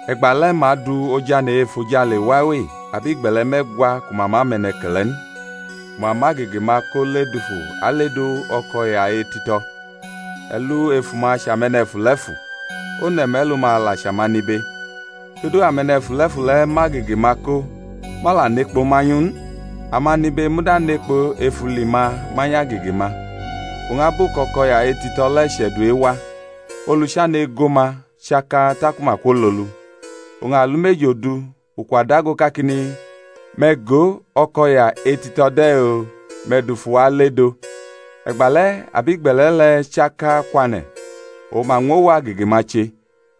E̩gba le̩ ma adu ojane̩ e-efojale wawe abigbe̩le̩ me̩gwa ku ma ma mʼe̩ne̩ke̩le̩ n, ku ma mʼagege-ma ko ledufu aledo o̩ko̩ya etito̩. E̩lu ef uma chʼame̩ne̩fule̩fu, one̩ me̩lu-ma la chʼamanibe. Todu ame̩ne̩fule̩fu le̩ mʼagege-ma ko, ma la nʼekpo manyʼu n. Amanibe muda nʼekpo ef uli-ma manyʼagege-ma. Oñ abu kʼo̩ko̩ya etito̩ le̩ che̩du ewa, olu chane̩ ago ma chaka taku ma kwololu. Oñ alumeji odu ukwa dago kakini, Me̩ go, o̩ko̩ya etito̩ de̩-oo! Me̩ dufu wa ale-dʼo. E̩gba le̩ abigbe̩le̩ le̩ chaka kwane̩, oñ ma ñwʼowu agege-ma che.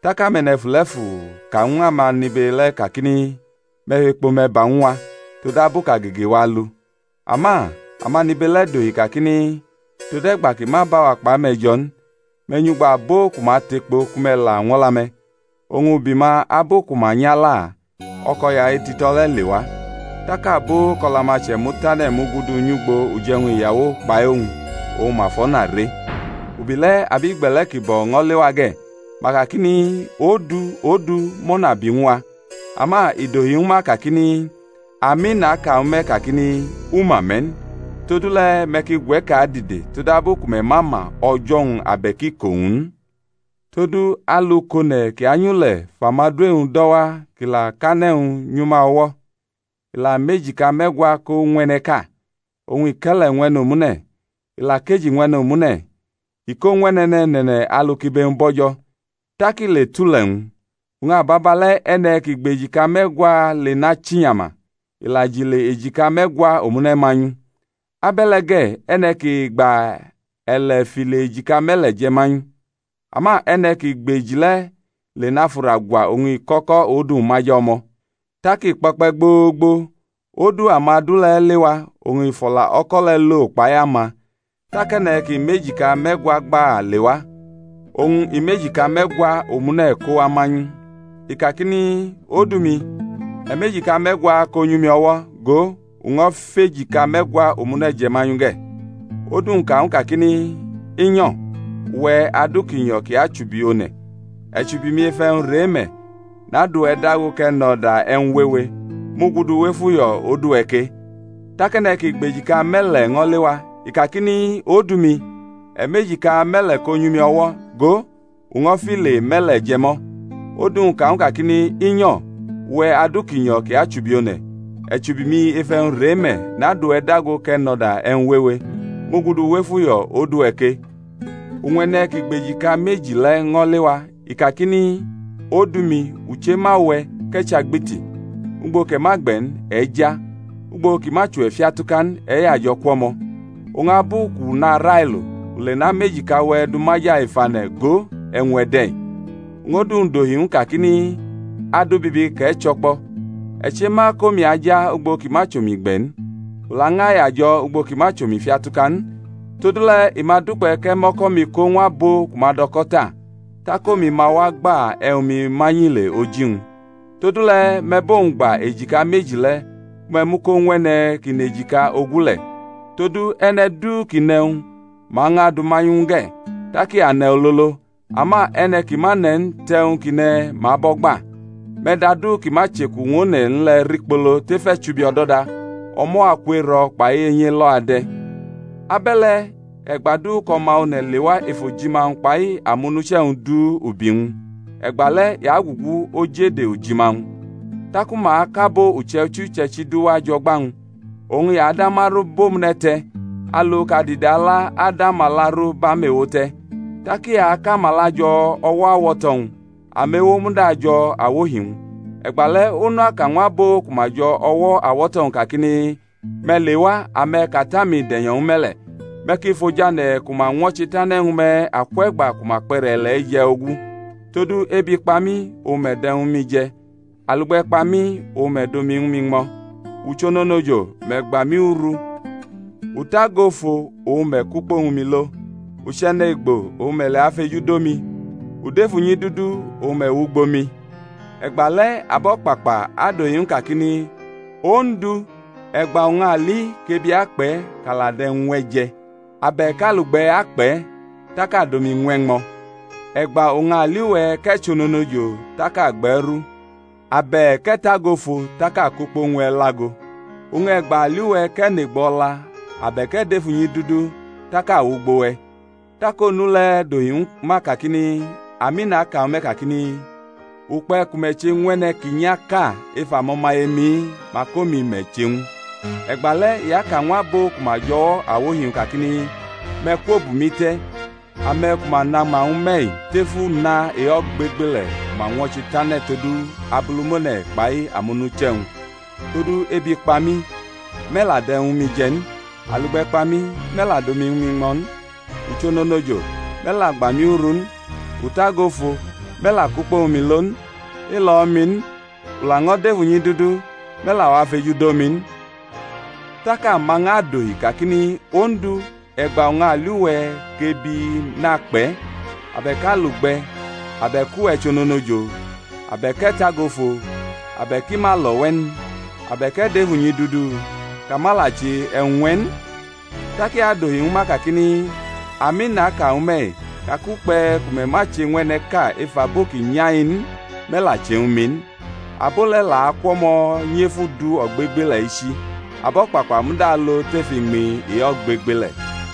Tak ame̩ne̩fule̩fu ka ñw amanibe le̩ kakini, Me̩ fʼekpo-me̩ ba ñw a, todabu kʼagege-wa alu. Ama amanibe le̩ dohi kakini, Tode̩gba kʼi ma bʼawa kpʼame̩ jo̩ n; me̩ nyʼugbo abo ku ma tʼekpo ku me̩ la ñw o̩la-me̩. Oñ ubi ma abu ku ma nyʼala, o̩ko̩ya etito̩ le̩ lewa. Tak abo kʼo̩la-ma chʼe̩mu tane̩ mugudu nyʼugbo uje̩wñ iyawo kpai owñ, oñ ma fʼo̩na re. Ubi le̩ abigbe̩le̩ ki bo̩ ño̩ lewa ge̩; ma kakini, Odu, odu, mʼo̩na bi ñw a. Ama i dohi ñwu ma kakini, Ami, naka ñwu me̩ kakini, U ma me̩ n. Todule̩ me̩ ki gwe̩ke̩ adide, todabu ku me̩ ma ma o̩jo̩-wñ abe̩k iko-wñ n. Todu alu kʼone̩ kʼi anyʼule̩ fʼamadu e-wñ do̩ wa kʼi la kʼane̩-wñ nyʼuma o̩wo̩; i la mʼejika me̩gwa ko ñw e̩ne̩ʼka, oñ i kʼe̩le̩ ñw e̩ne̩ omune̩, i la kʼeji ñw e̩ne̩ omune̩; i ko ñw e̩ne̩ne̩ne̩ne̩ alu kʼibe-wñ bo̩jo̩, tak i le tʼule̩-wñ. Oñ ababa le̩ e̩ne̩ ki gbʼejika me̩gwa le nachinyama; i la jʼile ejika me̩gwa omune̩ manyʼu. Abe̩le̩ ge̩, e̩ne̩ ki gba e̩le̩ fʼile ejika me̩le̩ je̩ manyʼu. Ama e̩ne̩ ki gbʼeji le̩ le nafʼura gwa, oñ i kʼo̩ko̩ odu-wñ maja o̩mo̩. Tak i kpo̩kpe̩ gboogbo, odu amadu le̩ lewa, oñ i fʼo̩la o̩ko̩ le̩ lo kpai ama. Tak e̩ne̩ ki mʼejika me̩gwa gba lewa, oñ i mʼejika me̩gwa omune̩ ko wa manyʼu; i kakini, Odu-mi, e̩ mʼejika me̩gwa ko nyʼumi o̩wo̩, go, u ño̩ fʼejika me̩gwa omune̩ je̩ manyʼu ge̩. Odu-wñ ka ñw u kakini, I nyo̩! uwe̩, adu ki nyo̩ ki achubi one̩. E̩ chubi-mi ef e̩wñ re me̩, nadʼuwe̩ dago kʼe̩ nʼo̩da e̩wñ wewe; mugudu wʼef uyo̩ odu-we̩ ke. Tak e̩ne̩ ki gbʼejika me̩le̩ le̩ ño̩ lewa; i kakini, Odu-mi, e̩ mʼejika me̩le̩ ko nyʼumi o̩wo̩; go, u ño̩ file me̩le̩ je̩ mʼo̩. Odu-wñ ka ñw u kakini, I nyo̩! uwe̩, adu ki nyo̩ kʼi achubi one̩. E̩ chubi-mi ef e̩wñ re me̩, nadʼuwe̩ dago kʼe̩ nʼo̩da e̩wñ wewe; mugudu wʼef uyo̩ odu-we̩ ke. Oñ e̩ne̩ ki gbʼejika meji le̩ ño̩ lewa; i kakini, Odu-mi, u chema uwe̩, kʼe̩ chʼagbiti; ugbo kʼe̩ ma gbe̩ n, e̩ ja; ugbo ki ma chʼuwe̩ fiatuka n, e̩ yajo̩ kwʼo̩mo̩; oñ abu kʼu narailo, u le namʼe̩jika-we̩ du maja ef ane̩; go, e̩wñ-we̩ de̩-i. Oñ odu-wñ dohi ñw u kakini, Adu bibi kʼe̩ chʼo̩kpo̩! E̩ chema kʼomi aja ugbo ki ma chʼomi gbe̩ n, u lañʼayajo̩ ugbo ki ma chʼomi fiatuka n; todule̩ i ma dukpe̩ kʼe̩ mʼo̩ko̩-mi ko ñw abo ku ma dʼo̩ko̩ ta, tak omi ma wa agba e̩wñ-mi manyʼile oji-wñ. Todule̩ me̩ bʼowñ gba ejika meji le̩ ku me̩ mʼu ko ñw e̩ne̩ ki nʼejika ogu le̩. Todu e̩ne̩ du kʼi nʼe̩wñ, ma ñʼadʼu manyʼu ñw u ge̩, tak i ane̩ ololo; ama e̩ne̩ ki ma ne̩ n tʼe̩wñ kʼi ne̩ ma abʼo̩ gba. Me̩ dʼadu ki ma chʼeku ñw one̩ n le̩ rikpolo tef e̩chubi o̩do̩da; o̩mo̩ aku ero̩ kpai enyi e̩lo̩ ade̩. Abe̩le̩ e̩gba du kʼO̩ma One̩ lewa ef ojima-wñ kpai amonuche̩-wñ du ubi-wñ, e̩gba le̩ i agugu oj ede ojima-wñ. Taku ma akʼabo uche̩ichi uche̩ichi du wa jʼo̩gba-wñ. Oñ i ada ma ru bʼomune̩ te̩, alu kʼadide ala adʼamala ru bʼamewo te̩; tak i akʼamala jo̩ o̩wo̩ awo̩to̩-wñ; amewo muda ajo̩ awohi-wñ. E̩gba le̩ Onu aka ñw abo ku ma jo̩ o̩wo̩ awo̩to̩-wñ kakini, Me̩ lewa, ame̩ kʼAta-mi de̩nyo̩ ñwu me̩ le̩. Me̩ ki fʼojane̩ ku ma ñwo̩che tane̩ ñwu me̩ akwe̩gba ku ma kpʼe̩re̩ ile̩-i je̩ ogu: todu ebi kpa mi, oñ me̩ dʼe̩wñ ñwu mi je̩; alugbe̩ kpa mi, oñ me̩ dʼomi ñwu mi ñmo̩; u chʼononojo, me̩ gba mi uru; u tago ofo, oñ me̩ kʼukpo ñwu mi lo; u chʼe̩ne̩gbo, oñ me̩ lewa fejudo mi; u dʼef unyidudu, oñ me̩ wʼugbo mi. E̩gba le̩ abo̩kpakpa adʼohi ñw u kakini, Ondu, e̩gba oñ a li kʼebi akpʼe̩ kʼa la dʼe̩wñ ñw e̩ je̩? abe̩k alugbe̩ akpʼe̩, tak a dʼomi ñw e̩ ñmo̩? E̩gba oñ a li uwe̩ kʼe̩ chʼononojo tak a gbʼe̩ ru? abe̩k e̩ tago ofo tak a kʼukpo ñw e̩ lʼago? Oñ e̩gba a li uwe̩ kʼe̩ nʼe̩gbo o̩la, abe̩k e̩ dʼef unyidudu, tak a wʼugbo we̩? Tak Onu le̩ adohi ñwu ma kakini, Ami, naka ñwu me̩ kakini, Ukpe̩ ku me̩ che ñw e̩ne̩ ki nyaʼka ef amo̩maye-mi-i, mak omi me̩ che ñwu. E̩gba le̩ i aka ñw abo ku ma jʼo̩wo̩ awohi-wñ kakini, Me̩ kwo bʼumi te̩, ame̩ ku ma nama ñwu me̩-i tef una e-ogbegbele̩ ku ma ñwo̩che tane̩ todu Abulumone̩ kpai amonuche̩-wñ. Todu, ebi kpa mi, me̩ la dʼe̩wñ ñwu mi je̩ n; alugbe̩ kpa mi, me̩ la dʼomi ñwu mi ñmo̩ n; u chʼononojo, me̩ la gba mi uru n; u tago ofo, me̩ la kʼukpo ñwu mi lo n; i lo̩ mi n, u laño̩ dʼef unyidudu, me̩ la wa fejudo mi n. Tak ama ñʼadohi kakini, Ondu, e̩gba oñ a li uwe̩ kʼebi nakpʼe̩? abe̩k alugbe̩? abe̩k uwe̩ chʼononojo? abe̩k e̩ tago ofo? abe̩k i ma lo̩ we̩ n? abe̩k e̩ dʼef unyidudu? kʼa ma la che e̩wñ ñw e̩ n? Tak i adohi ñwu ma kakini, Ami, naka ñwu me̩-i ka kʼukpe̩ ku me̩ ma che ñw e̩ne̩ʼka ef abo ki nya-i n, me̩ la che ñwu mi n. Abo le̩ la akwʼo̩mo̩ nyʼef udu ogbegbele̩ echi; abo̩kpakpa muda alo tʼef iñmi e-ogbegbele̩.